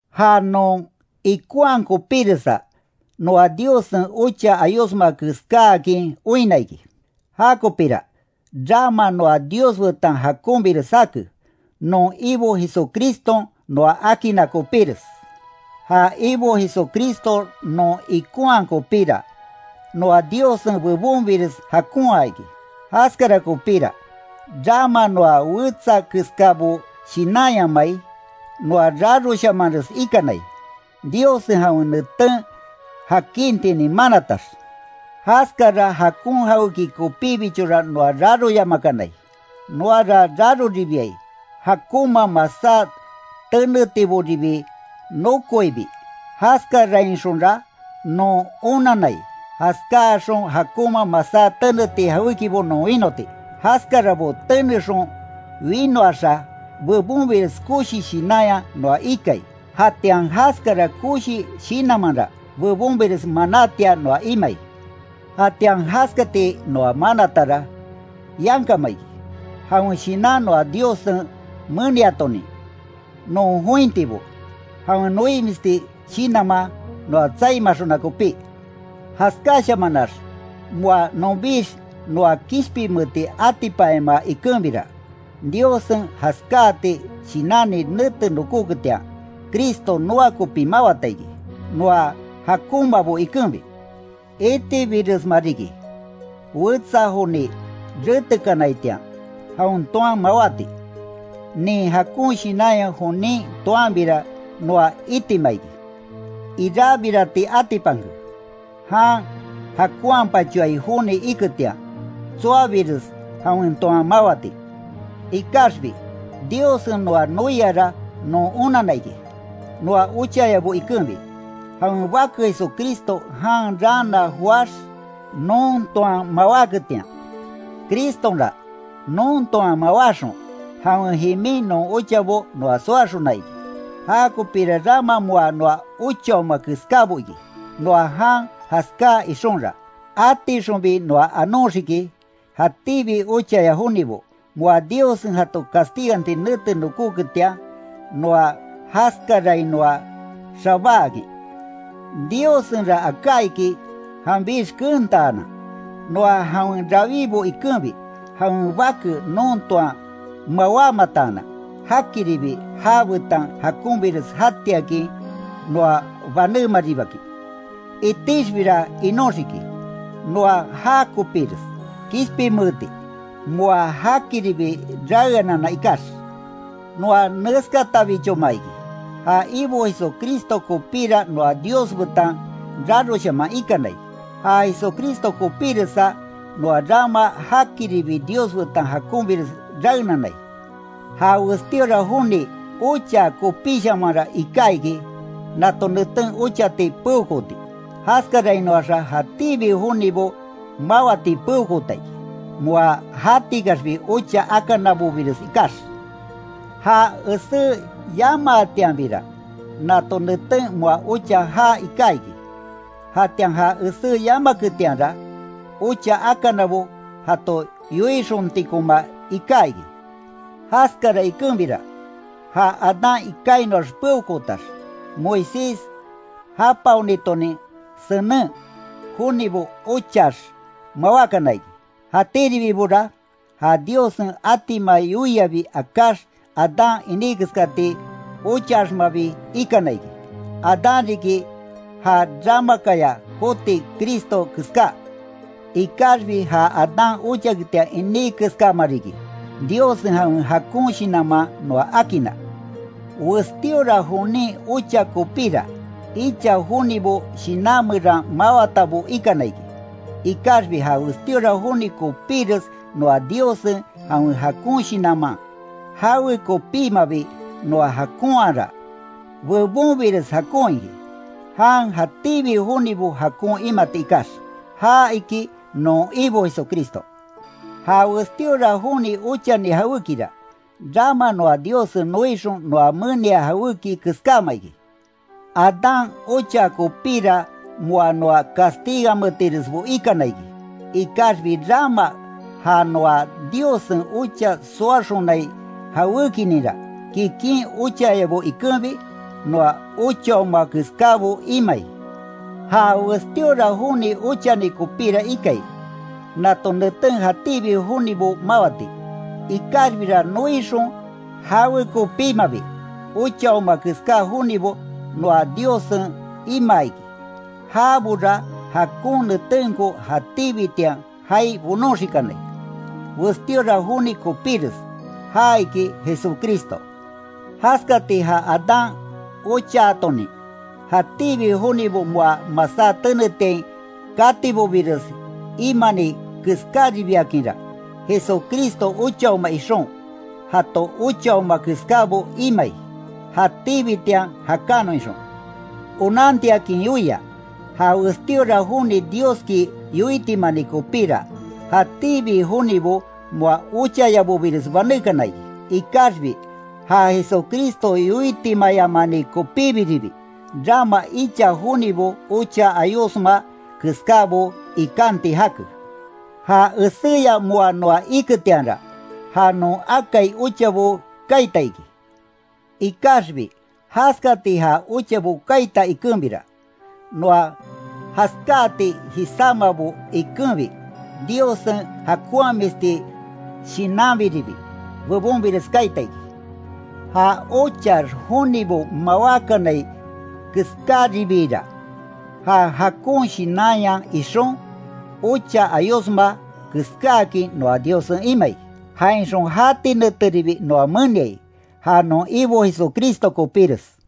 Ja non ikonhaa kopíresa, noa Diossen ocha ayosma keskáakin oinna iki. Jakopira, rama noa Dios betan jakonbires jake, non Ibo Jesucriston noa akinna kopíres. Ja Ibo Jesucristo non ikonhaa kopíra, noa Diossen bebonbires jakonhaa iki. Jaskara kopíra, rama noa wetsa keskabo shinanyamai, noa raroshamanres ikanai, Diossen jawen neten jakintinin manatax. Jaskara jakon jawéki kopíbichora noa raroyamakanai, noara raroribiai, jakonma masá tenetiboribi nokoibi, jaskarainxonra non onannai, jaskáaxon jakonma masá teneti jawékibo non wínoti. Jaskarabo tenexon winoaxa; bebonbires koshi shinanya noa ikai, jatian jaskara koshi shinanmanra, bebonbires manátia noa imai. Jatian jaskati noa manatara, yankama iki. Jawen Shinan noa Diossen meniatonin, non jointibo, jawen noimisti shinanman noa tsaimaxona kopí. Jaskáshamanax moa nonbix noa kishpinmeeti atipanyamaa ikenbira, Diossen jaskáati shinanni nete nokoketian, Cristo noa kopi mawata iki, noa jakonmabo ikenbi. Itibiresma riki, wetsa joni retekanaitian, jaon toan mawáti. Nin jakon shinanya jonin toanbira noa itima iki. Irabirati atipanke, jan jakonhapachoai joni iketian, tsoabires jawen toan mawati. Ikaxbi, Diossen noa noiara non onanna iki, noa ochayabo ikenbi, jawen Bake Jesucristo jan raana joáx, non toan mawáketian. Cristonra, non toan mawáxon, jawen jimin non ochabo noa soaxona iki. Jakopira rama moa noa ochaoma keskábo iki. Noa jan jaskáa ixonra, atixonbi noa anoxiki, jatíbi ochaya jonibo, moa Diossen jato castiganti nete nokóketian, noa jaskarainoa xabáakin. Diossenra aká iki janbix keentaanan, noa jawen rawibo ikenbi, jawen Bake non toan mawámataanan, jakiribi jabetan jakonbires jatiakin noa banémaribakin. Itixbira inóxiki, noa já kopires kishpinmeeti, moa jakiribi raeanana ikax. Noa neskatabichoma iki, ja Ibo Jesucristo kopíra noa Dios betan raroshaman ikanai, ja Jesucristo kopiresa noa rama jakiribi Dios betan jakonbires raenanai. Ja westíora joni ochaa kopíshamanra iká iki, nato neten ochati peokooti, jaskarainoaxa jatíbi jonibo mawati peokoota iki, moa jatikaxbi ocha akanabobires ikax. Ja esé yamaatianbira, nato neten moa ocha jaa iká iki. Jatian ja esé yamaketianra, ocha akanabo jato yoixontikoma iká iki. Jaskara ikenbira, ja Adán ikainoax peokootax, Moisés japaonitonin senen, jonibo ochaax mawákana iki. Jatiribibora, ja Diossen atima yoiabi akáx Adán iní keskati ochaaxmabi ikana iki. Adán riki ja ramakaya joti Cristo keska. Ikaxbi ja Adán ochaketian iní keskama riki, Diossen jawen jakon shinanman noa akinna. Westíora jonin ocha kopíra, icha jonibo shinan meran mawatabo ikana iki. Ikaxbi ja westíora joni kopíres noa Diossen jawen jakon shinanman, jawe kopímabi noa jakonhaara, bebonbires jakon iki, jan jatíbi jonibo jakon imati ikax. Ja iki non Ibo Jesucristo. Ja westíora joni ochani jawékira, rama noa Diossen noixon noa menia jawéki keskáma iki. Adán ochaa kopíra moa noa castigametiresbo ikana iki, ikaxbi rama ja noa Diossen ocha soaxonai jawékininra, kikin ochayabo ikenbi, noa ochaoma keskábo imai. Ja westíora joni ochani kopíra ikai, nato neten jatíbi jonibo mawáti. Ikaxbira noixon jawe kopímabi, ochaoma keská jonibo noa Diossen imaa iki. Jabora jakon netenko jatíbitian jaai bonoxikanai, westíora joni kopíres, ja iki Jesucristo. Jaskati ja Adán ochaatonin, jatíbi jonibo moa masá tenetiain katibobires imani keskáribiakinra, Jesucristo ochaoma ixon, jato ochaoma keskábo imai, jatíbitian jakánnon ixon. Onantiakin yoia; Ja westíora joni Dioski yoitimani kopíra, jatíbi jonibo moa ochayabobires banékana iki. Ikaxbi, ja Jesucristo yoitimayamani kopíbiribi, rama icha jonibo ocha ayosma keskábo ikanti jake. Ja eséya moa noa iketianra, ja non akai ochabo kaita iki. Ikaxbi jaskati ja ochabo kaita ikenbira, noa jaskáati jisámabo ikenbi, Diossen jakonhamisti shinanbiribi bebonbires kaita iki. Ja ochaax jonibo mawákanai keskáribiira, ja jakon shinanya ixon, ocha ayosma keskáakin noa Diossen imai, jainxon jati neteribi noa meniai, ja non Ibo Jesucristo kopíres.